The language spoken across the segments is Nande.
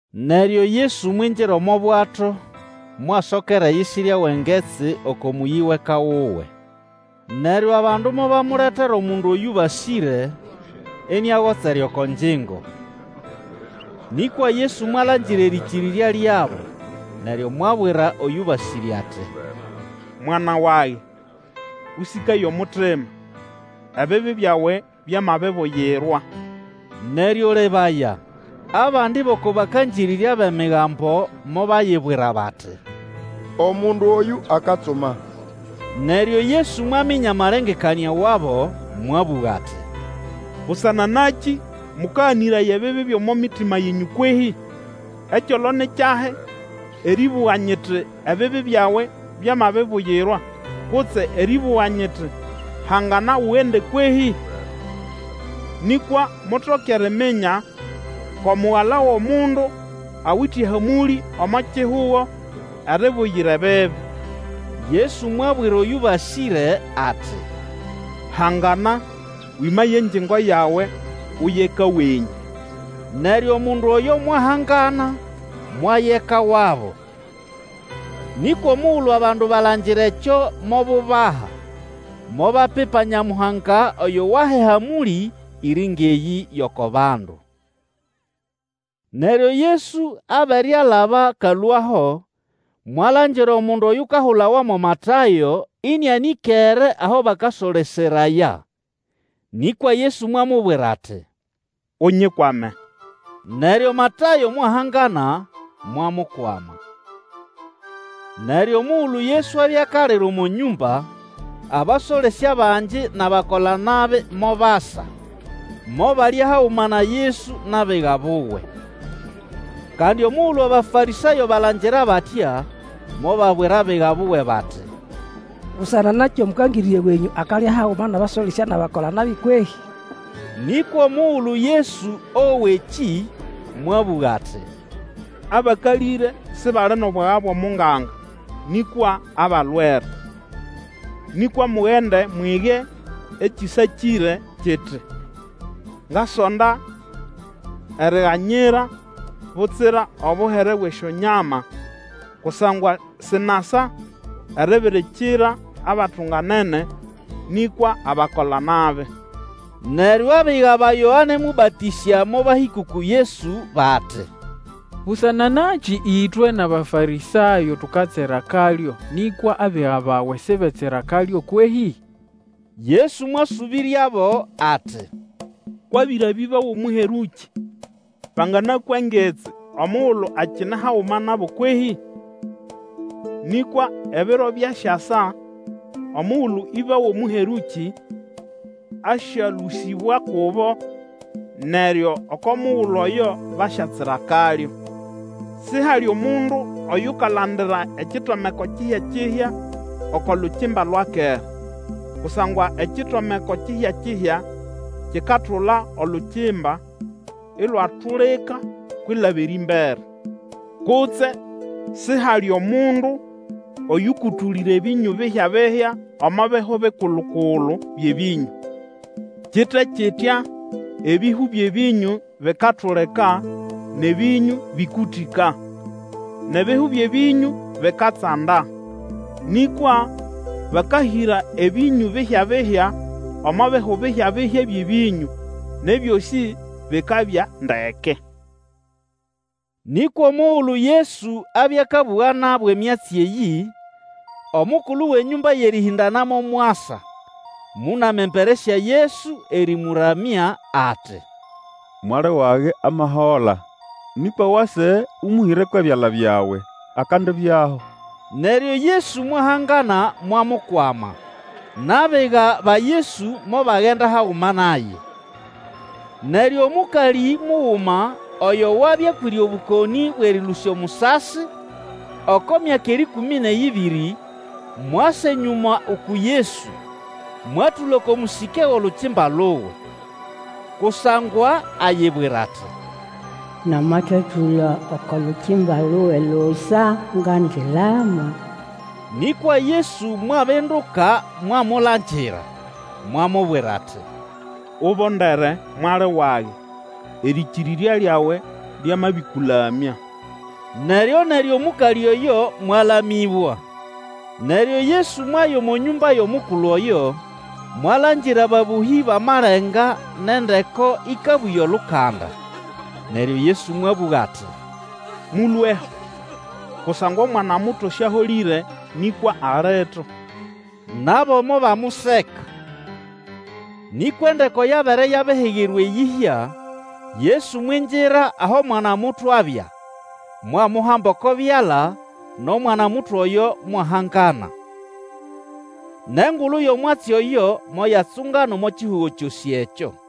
Neryo Yesu mwingira omo bwato, mwasokera eyisirya wʼengetsi oko mũyĩ wʼeka wuwe. Neryo abandu mobamuletera omundu oyũbasĩre, iniagotsere oko ngingo. Nĩkwa Yesu mwalangira erĩkĩrĩrya lyabo, neryo mwabwira oyũbasĩre ati, Mwana wage, Ũsĩkaye omutima! Ebibi byawe byamabibuyirwa. Neryo lebaya, abandi bʼoko bakangĩrĩrya bʼEmigambo mobayibwira bati, Omundu oyũ akatsuma. Neryo Yesu mwaminya amalengekanĩa wabo, mwabũga ati, Busana nakĩ mukaganĩraya ebibi byʼomo mitima yenyũ kwehĩ? Ekyolo ni kyahi, erĩbũga nyiti, Ebibi byawe byamabibuyirwa, kutse erĩbũga nyiti, Hangana, ugende, kwehĩ? Nĩkwa mutoke eriminya kʼomugala wʼomundu awite hamũlĩ omo kihugo eribuyira ebibi, Yesu mwabwira oyũbasĩre ati, Hangana, wĩmaye engingo yawe, uye eka wenyũ! Neryo omundu oyo mwahangana, mwaya eka wabo. Nĩkwa omugulu abandu balangira ekyo mobubaha, mobapipa Nyamuhanga oyo waha ehamũlĩ iri ngʼeyĩ yʼoko bandu. Neryo Yesu abere alaba akalũaho, mwalangira omundu oyukahulawa mo Matayo, ĩnĩanĩkere aho bakasoleseraya. Nĩkwa Yesu mwamubwira ati, Unyikwame, neryo Matayo mwahangana, mwamukwama. Neryo omugulu Yesu abya akalira omo nyũmba, abasolesya bangi nʼabakola-nabi mobasa, mobalya haguma na Yesu nʼabiga buwe. Kandi omugulu Abafarĩsayo balangira batya, mobabwira abiga buwe bati, Busana nakĩ Omũkangĩrĩrya wenyũ akalya haguma nʼabasolesya nʼabakola-nabi kwehĩ? Nĩkwa omugulu Yesu owa ekĩ, mwabũga ati, Abakalĩre sibali nʼobwaga bwʼomunganga, nĩkwa abalwere. Nĩkwa mugende mwige ekĩsakĩre kiti, Ngasonda eriganyira, butsira obuhere bwʼesyonyama; kusangwa sinasa eribirikira abatunganene, nĩkwa abakolanabi. Neryo abiga ba Yoane Mũbatĩsya mobahĩka uku Yesu bati, Busana nakĩ ĩtwe nʼAbafarĩsayo tukatsira akalyo, nĩkwa abiga bawe sibetsira akalyo kwehĩ? Yesu mwasũbĩryabo ati, Kwʼabĩra bʼĩba wʼomũherũkĩ banganakwa ngitsi omugulu akine haguma nabo kwehĩ? Nĩkwa ebiro byasyasa omugulu ĩba wʼomũherũkĩ asyalũsĩbwa kubo, neryo oko mugulu oyo basyatsira akalyo. Sihali omundu oyukalandira ekitomeko kihya-kihya oko lukimba lwa kera, kusangwa ekitomeko kihya-kihya kikatula olukimba, ilwatulika kwilaba erĩmbere. Kutse sihali omundu oyũkũtũlĩra ebĩnyũ bihya-bihya omo bihu bikulu-kulu byʼebĩnyũ. Kite kitya ebihu byʼebĩnyũ bikatulika, nʼebĩnyũ bĩkũtĩka, nʼebihu byʼebĩnyũ bikatsanda; nĩkwa bakahĩra ebĩnyũ bihya-bihya omo bihu bihyabihya byʼebĩnyũ, nʼebyosĩ bikabya ndeke. Nĩkwa omugulu Yesu abya akabũga nabo emyatsi eyĩ, omukulu wʼenyũmba yʼerĩhĩndanamo mwasa, mũnama embere sya Yesu erĩmũramya ati, Mwali wage amahola; nĩkwa wase ũmũhĩre kwʼebyala byawe, akandibyaho. Neryo Yesu mwahangana mwamukwama, nʼabiga ba Yesu mobagenda haguma naye. Neryo omũkalĩ muguma, oyo wabya akwĩre obũkonĩ bwʼerĩlũsya omusasi, oko myaka erĩkũmĩ nʼeyĩbĩrĩ, mwasa enyũma uku Yesu, mwatũla oko mũsĩke wʼolukimba luwe. Kusangwa ayibwira ati, Nanatatũla oko lukimba luwe lusa, ngandilama. Nĩkwa Yesu mwabinduka mwamulangira, mwamubwira ati, Ubondere, mwali wage! Erĩkĩrĩrya lyawe lyamabĩkũlamya. Neryo-neryo omũkalĩ oyo mwalamĩbwa. Neryo Yesu mwaya omo nyũmba yʼomukulu oyo, mwalangira ababũhĩ bʼamalenga nʼendeko ikabũya olukanda. Neryo Yesu mwabũga ati, Mũlũeho! Kusangwa omwana-muto siaholĩre, nĩkwa alito! Nabo mobamuseka. Nĩkwa endeko yabere yabihigirwa eyĩhya, Yesu mwingira aho mwana-muto abya, mwamuhamba oko byala, nʼomwanamuto oyo mwahangana. Nʼengulu yʼomwatsi oyo moyatsungana omo kihugo kyosĩ ekyo.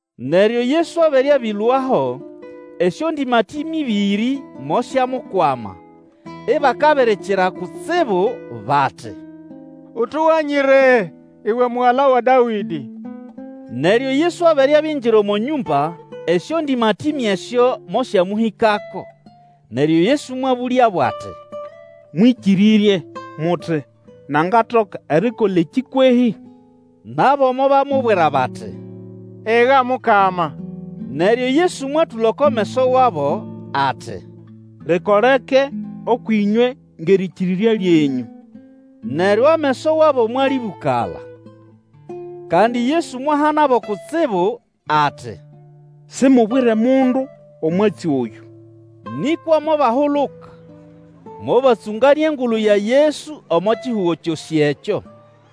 Neryo Yesu abere abĩlũaho, esyondĩmatĩme ĩbĩrĩ mosyamukwama, ibakabirikira kutsibu bati, Utuganyire, uwe Mugala wa Dawĩdĩ! Neryo Yesu abere abingira omo nyũmba, esyondĩmatĩme esyo mosyamũhĩkako, neryo Yesu mwabũlyabo ati, Mwĩkĩrĩrye muti, nangatoka erikola ekĩ kwehĩ? Nabo mobamubwira bati, Ega Mukama. Neryo Yesu mwatũla oko meso wabo, ati, Likoleke ũkwʼĩnywe ngʼerĩkĩrĩrya lyenyũ! Neryo ameso wabo mwalĩbũkala. Kandi Yesu mwahanabo kutsibu ati, Simubwire mundu omwatsi oyũ. Nĩkwa mobahuluka, mobatsũnganĩa engulu ya Yesu omo kihugo kyosĩ ekyo.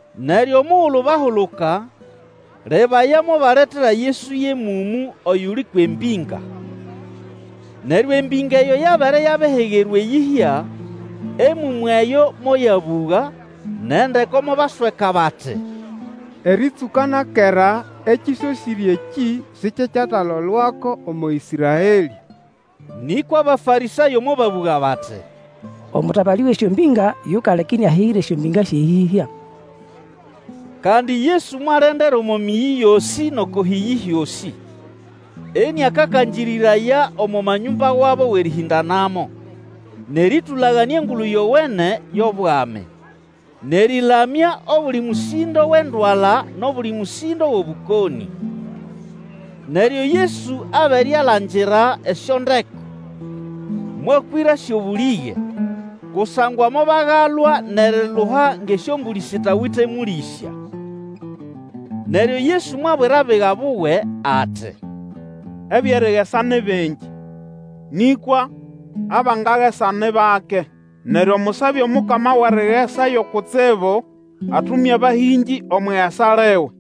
Neryo omugulu bahuluka, lebaya mobaletera Yesu yʼemũmũ oyuli kwʼembĩnga. Neryo embĩnga eyo yabere yabihigirwa eyĩhya, emũmũ eyo moyabũga, nʼendeko mobasweka bati, Erĩtsũka na kera ekĩsosĩre ekĩ sikyekyatalolwako omo Ĩsraelĩ! Nĩkwa Abafarĩsayo mobabũga bati, Omũtabalĩ wʼesyombĩnga yukaleka iniahigira esyombĩnga syʼeyĩhya. Kandi Yesu mwalendera omo mĩyĩ yosĩ nʼoko hĩyĩ hyosĩ, iniakakangĩrĩraya omo manyũmba wabo wʼerĩhĩndanamo, nʼerĩtũlaganĩa Engulu Yowene yʼobwami, nʼerĩlamya obuli mũsĩndo wʼendwala nʼobuli mũsĩndo wʼobũkonĩ. Neryo Yesu abere alangira esyondeko, mwakwĩrasyo bũlĩge, kusangwa mobagalwa nʼeriluha ngʼesyombũlĩ sitawite mũlĩsya. Neryo Yesu mwabwira abiga buwe ati, Ebyʼerigesa ni bingi, nĩkwa abangagesa ni bake. Neryo musabe Omukama wʼerigesa yo kutsibu atume abahĩngĩ omwʼigesa liwe.